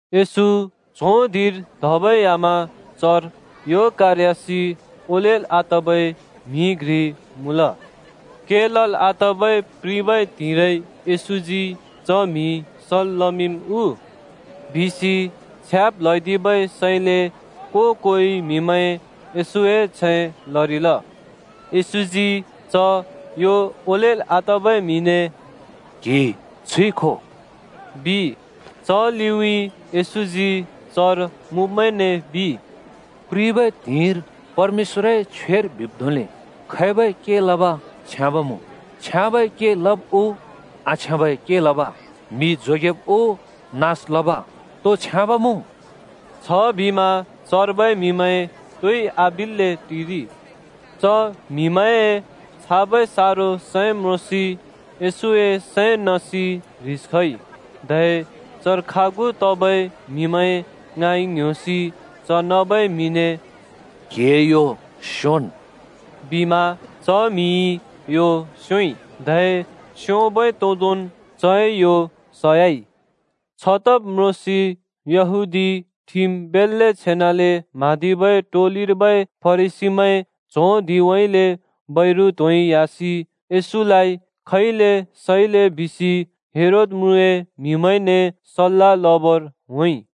येशू च्हों धिंर धबै ह्‍यामा चर यो कारयासि ओलेल् आतबै म्‍हि घ्रि मुँल। “के लल् आतबै प्रिबै त्हिंइरै येशूजी च म्‍हि सल् लमिंम् उ?” बिसि छ्याब् ल्‍हैदिबै सैंले को-कोइ म्हिमैं येशूए छैं लरिल। येशूजी च यो ओलेल् आतबै म्‍हिने, “क्‍हि छुइ खो,” बिइ। च लिउँइँ येशूजी चर मुँब्‍मैंने बिइ, “प्रिबै त्हिंइर परमेश्‍वरए छ्वेर बिब् धोंले खैबै के लब छ्याँब मुँ, छ्याँबै के लब् उ, आछ्याँबै के लब? म्‍हि जोगेदिब् उ, नास लब, तो छ्याँब मुँ?” छबिमा चर्बै म्‍हिमैं तोइ आबिल्‍ले टिरिइ। च म्‍हिमैंए छाबै सारो सैं म्रोंसि येशूए सैं नसि ह्रिस खइ। धै चर खागु तबै म्हिमैं ङाँइ ङ्‌ह्‍योसि च नबै म्‍हिने “क्‍हिए यो स्‍योंन्!” बिमा च म्‍हिइ यो स्‍योंइ। धै स्योंबै तोदोंन् चए यो सयाइ। छतब् म्रोंसि यहूदी ठिम बेल्‍ले छेनाले म्हाँदिबै टोलिर्बै फरिसीमैं च्हों धिंउँइँले बैरु त्‍होंइ ह्‍यासि येशूलाइ खैले सैले बिसि हेरोद म्रुँए म्हिमैंने सल्‍ला लबर होंइ।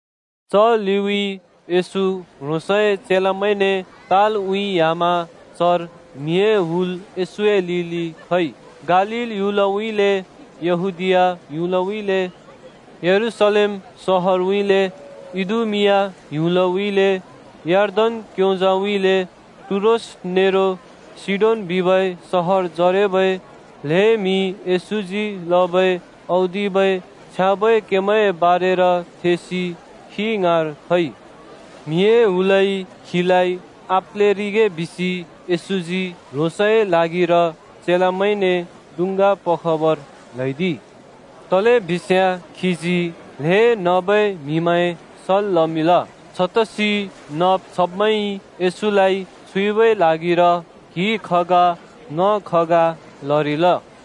च लिउँइँ येशू ह्रोंसए चेलामैंने तालउँइँ ह्‍यामा चर म्हिए हुल येशूए लिलि खइ। गालील ह्‍युलउँइँले, यहूदीया ह्‍युलउँइँले, यरूशलेम सहरउँइँले, इदुमिआ ह्‍युलउँइँले, यर्दन क्‍योंजाउँइँले, टुरोस नेरो सीडोन बिबै सहरजरेबै ल्हें म्हि येशूजी लबै औदिबै छ्याँबै केमैंए बारेर थेसि खी ङाँर खइ। म्हिए हुलइ खीलाइ आप्‍लेरिगे बिसि येशूजी ह्रोंसए ल्हागिर चेलामैंने डुँङ्गा पखबर ल्हैदिइ। तलेबिस्याँ खीजी ल्‍हें नबै म्‍हिमैं सल् लमिंल, छतसि नब् छब्मैंइ येशूलाइ छुइबै ल्हागिर क्हि खगा ङ खगा लरिल।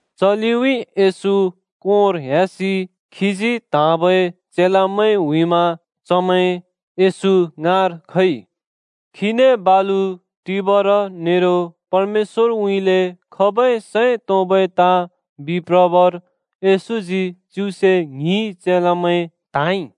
च लिउँइँ येशू कोंर ह्‍यासि खीजी त्हाँबै चेलामैं हुइमा चमैं येशू ङाँर खइ। खीने बालु टिबर नेरो परमेश्‍वरउँइँले खबै सैं तोंबै ताँ बिप्रबर येशूजी च्युसे ङ्हि चेलामैं त्हाँइ।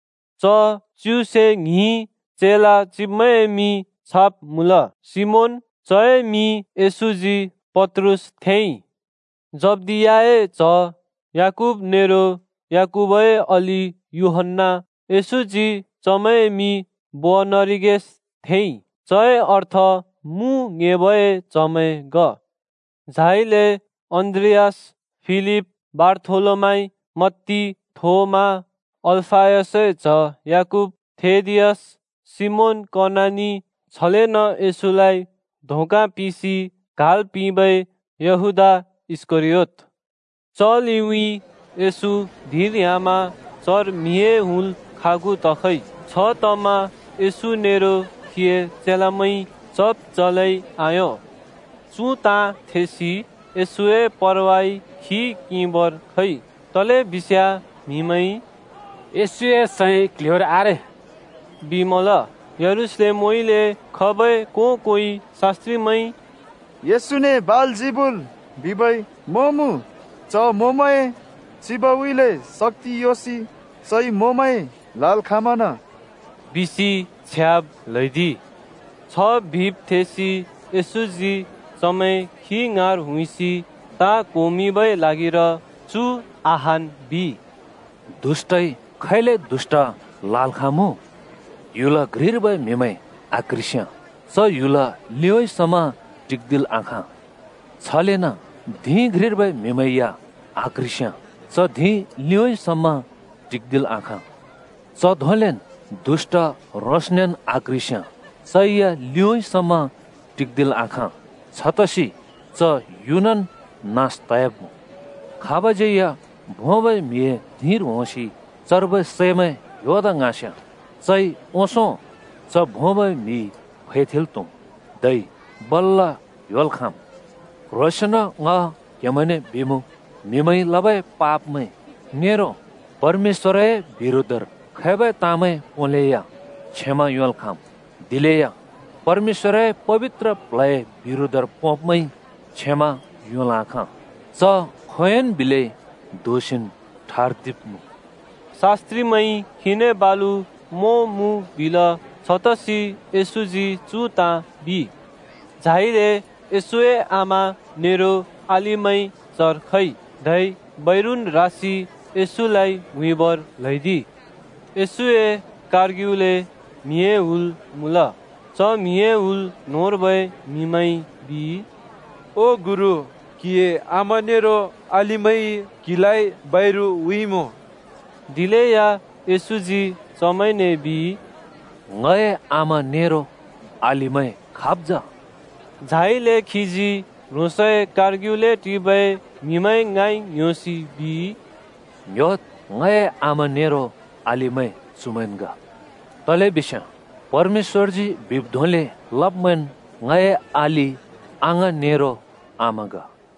च च्युसे ङ्हिं चेला चिब्मैंए मिं छाब् मुँल: सिमोन, चए मिं येशूजी पत्रुस थेंइ, जब्दियाए च्‍ह याकूब नेरो याकूबए अलि यूहन्‍ना। येशूजी चमैंए मिं बोअनरिगेश थेंइ, चए अर्थ मु ङ्‌हेबए च्हमैं ग। झाइले अन्‍द्रियास, फिलिप, बारथोलोमाइ, मत्ती, थोमा, अल्‍फयसए च्‍ह याकूब, थेदियास, सिमोन कनानी, छलेन येशूलाइ धोका पिंसि क्हाल् पिंबै यहूदा इस्‍करियोत। च लिउँइँ येशू धिंर ह्‍यामा चर म्हिए हुल खागु तखइ। छतमा येशू नेरो खीए चेलामैंइ चब् चलै आयों। चु ताँ थेसि येशूए परवाइ खी किंबर खइ, तलेबिस्याँ म्हिमैंइ “येशूए सैं क्ल्ह्‍योर आरे” बिमल। यरूशलेमउँइँले खबै को-कोइ शास्‍त्रिमैंइ “येशूने बालजिबुल बिबै मों मुँ, च मोंमैंए चिबउँइँले शक्‍ति योंसि चइ मोंमैं ल्‍हाल् खाँमना बिसि छ्याब् ल्हैदिइ!” छ बिब् थेसि येशूजी चमैं खी ङाँर हुइसि ताँ क्होमिंबै ल्हागिर चु अहान् बिइ, “दुष्‍टइ खैले दुष्‍ट ल्‍हाल् खाँमुँ? ह्‍युल घ्रिर्बै म्हिमैं आक्‍ह्रिस्‍याँ च ह्‍युल लिउँइँ समा टिक्दिल् आखाँ। छलेन धिं घ्रिर्बै म्‍हिमैं या आक्‍ह्रिस्‍याँ च धिं लिउँइँ समा टिक्दिल् आखाँ। च धोंलेन् दुष्‍ट ह्रोंसनेन् आक्‍ह्रिस्‍याँ चै या लिउँइँ समा टिक्दिल् आखाँ, छतसि च युनन् नास तयाब्मुँ। “खाबज्यै या भोंबै म्‍हिए धिंर होंसि चर्बै सैमैं ह्‍योदा ङ्हाँस्याँ, चइ ओंसों च भोंबै म्‍हि फैथेंल् त्‍हुम्, धै बल्‍ल ह्‍योल् खाँम्। “क्ह्रोंसेंन ङ क्हेमैंने बिमुँ, म्‍हिमैंइ लबै पापमैं नेरो परमेश्‍वरए बिरोधर खैबै ताँमैं पोंलेया क्षमा योंल् खाँम्, दिलेया परमेश्‍वरए पबित्र प्ल्हए बिरोधर पोंब्मैंइ क्षमा योंल् आखाँ। च खोंयोंन् बिलै दोषिन् ठर्दिब्मुँ।” शास्‍त्रिमैंइ खीने बालु मों मुँ बिल, छतसि येशूजी चु ताँ बिइ। झाइले येशूए आमा नेरो अलिमैं चर खइ, धै बैरुन् रासि येशूलाइ हुइबर ल्हैदिइ। येशूए कारग्युले म्हिए हुल मुँल, च म्हिए हुल न्होंर्बै म्हिमैंइ बिइ, “ओ गुरु, क्‍हिए आमा नेरो अलिमैंइ क्‍हिलाइ बैरु हुइमुँ।” दिलेया येशूजी चमैंने बिइ, “ङए आमा नेरो अलिमैं खाब जा?” झाइले खीजी ह्रोंसए कारग्युले टिबै म्‍हिमैं ङाँइ ङ्‌ह्‍योसि बिइ, “ङ्‌ह्‍योद्, ङए आमा नेरो अलिमैं चुमैंन् ग। तलेबिस्याँ परमेश्‍वरजी बिब् धोंले लब्मैंन् ङए अलि, अङाँ, नेरो आमा ग।”